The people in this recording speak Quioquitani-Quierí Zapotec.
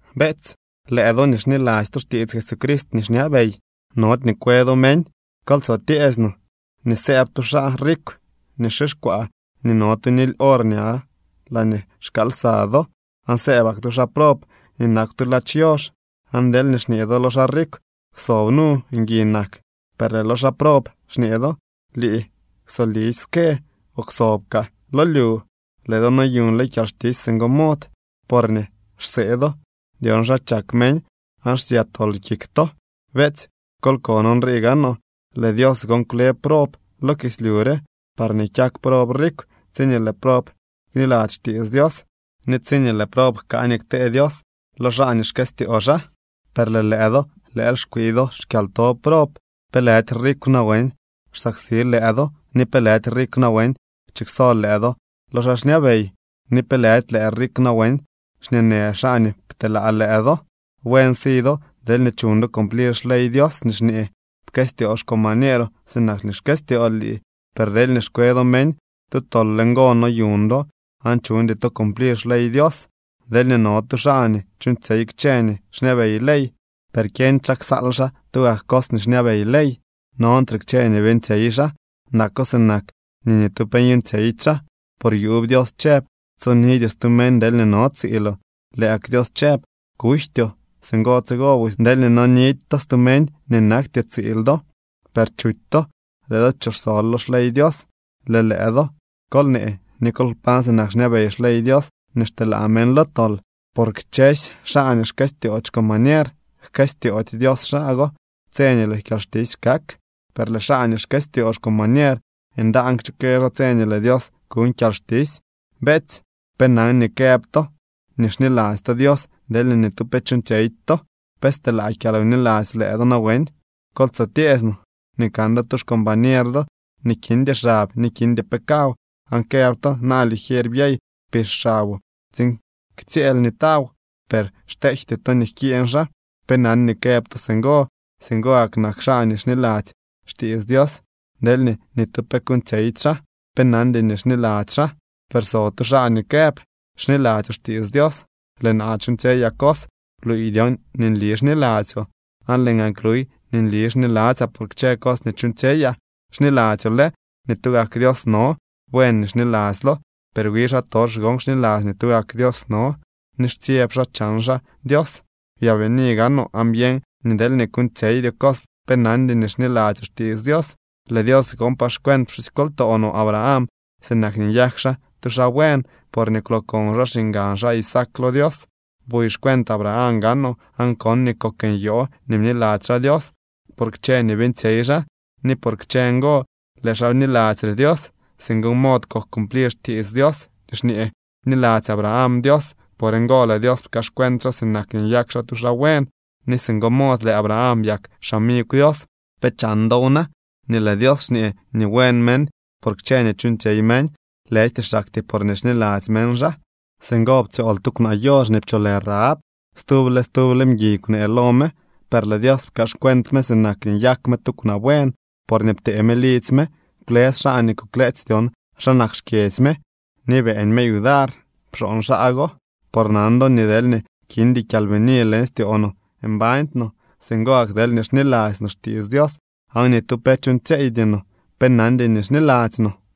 Beetsy, lëë do nii xniladzy to xtiits Jesucrist nii xñabey, nody nii kwe do meñ. Kol tso tyeesy no nii sëëb tu xaa rikw nii xixkwaa ni no tu nily or ña laañee xkaal lsa do, aan sëëbak tu xaa prob nii nakw tu ladx yox, aan deelñee xñee do lo xaa rikw: “Kwsob nu, ngui nak”, per lëë lo xaa prob xñee do: “Lii kwsolisy ske, o kwsob kaa lo lyu”, lëë do noyuñle kyalxtisy singo mod, porñee xsee do dyon xa chak meñ aan xsya tol kik to. Beetsy, kol kon nrii gaanoo: lëë Dios gon kwle prob lo kislyu re, parñee kyak prob rikw tsiñee lëë prob kniladzy xtiits Dios ni tsiñee lëë prob jkaa nii ktee Dios lo xaa nii xkëstyoo xaa. Per lëë lëë do lëël xkwii do xkyalto prob. ¿Pe lëdy rikw nawen xsaksi lëë do ni pe lëdy rikw nawen chikso lëë do lo xaa xñabey? ¿Ni pe lëdy lëë rikw nawen xñeenë xaa nii pteelaa lëë do? Buen si do deelñee chuñ do cumplir xley Dios nii xñee: “Pkëstyoo xcombañeeroo sinak nii xkëstyool lii.” Per deelñee xkwe do meñ, tu tol le ngo noyuñ do aan chuñdy to cumplir xley Dios. Deelñee no tu xaa nii chuuñtsyey kchë nii xñabey ley, per kyeñdy xaa ksal xaa tugak cos nii xñabey ley, nontre kchë nii beeñtsyey xaa. Nako sinak nii ni tu pe nyuuñtsyeydy xaa. Por yuub Dios chëb: “Tsonidyoo stu meñ deelñee no tsiiloo”, lëë gak Dios chëb: “Kujtyoo.” Singo tsigo busy, deelñee nonidy to stu meñ nii nakty tsiil do, per chuty to, lëë do pchooxsol lo xley Dios. Lëë lëë do kol nee ni kol kpañ sinak xñabey xley Dios nii xteelaa meñ lo tol. Por kchësy xaa nii xkëstyoody xcombañer jkëstyoody Dios xaa go tse nii lëë kyalxtisy kak. Per lëë xaa nii xkëstyoo xcombañer, ndaan kchukë xaa tse nii lëë Dios kuñ kyalxtisy. Beetsy, ¿pe nan nii këb to nii xniladzy to Dios, deelñee ni tu pe chuuñtsyeydy to? ¿Pe steelaa kyalwniladzy lëë do nawen? Kol tso tyeesy no nii kan do tu xcombañer do nii kindy xab ni kindy pe kaw, aan këb to: “Na ligier, byey, pix xaboo tsiin ktsyëël ni taw”, per xteejty to nii jkiiñ xaa, ¿pe nan nii këb to singo? Singo gak nak xaa nii xniladzy xtiits Dios deelñee ni tu pe kuuñtsyeydy xaa. Pe nandy nii xniladzy xaa. Per so tu xaa nii këb: “Xniladzyoo xtiits Dios, lëë naa chuuñtsyeyaa cos.” Bluuy dyon nii nli xniladzyoo, aan lëë gaan kluy nii nli xniladzyaa por kchë cos nii chuuñtsyeyaa. Xniladzyoo lë nii tugak Dios no. Buen nii xniladzylo, per wi xaatox gon xniladzy nii tugak Dios no, ni xtsyeb xaa chan xaa Dios. Byaabini gaanoo aan byeñ nii deelñee kuuñtsyeydyoo cos, pe nandy nii xniladzyoo xtiits Dios. Lëë Dios gon pkaaxcuent pxusykoltoo no Abraham sinak nii nyak xaa tu xaa buen porñee kwlookon xaa xiñgan xaa Isaac lo Dios. Buy xcuent Abraham gaanoo aan kon nii kok nyoo nii bniladzy xaa Dios, por kchë nii beeñtsyey xaa, ni por kchë ngo lëë xaa bniladzy re Dios. Singo mod kok cumplir xtiits Dios nii xñee: “Bniladzy Abraham Dios, por ngo lëë Dios pkaaxcuent xaa sinak nii nyak xaa tu xaa buen.” Ni singo mod lëë Abraham byak xamigw Dios. ¿Pe chan dow na, nii lëë Dios xñee nii buen meñ por kchë nii chuuñtsyey meñ, lëjty xaktyee porñee xniladzy meñ xaa? Singo ptsyool tu kwnaa yox nii pcholë Rahab. Stuble stuble mguiy kwnee lo me. Per lëë Dios pkaaxcuent me sinak nii nyak me tu kwnaa buen, porñee ptee me lidzy me kwlës xaa nii kukleetsy dyon xa nak xkyedzy me ni beeñ me yudar pxooñ xaa go. Por nan do nii deelñee kindy kyalbini leñ styoo no, mbañdy no. Singo gak deelñee xniladzy no xtiits Dios aan ni tu pe chuuñtsyeeydy no, pe nandy nii xniladzy no.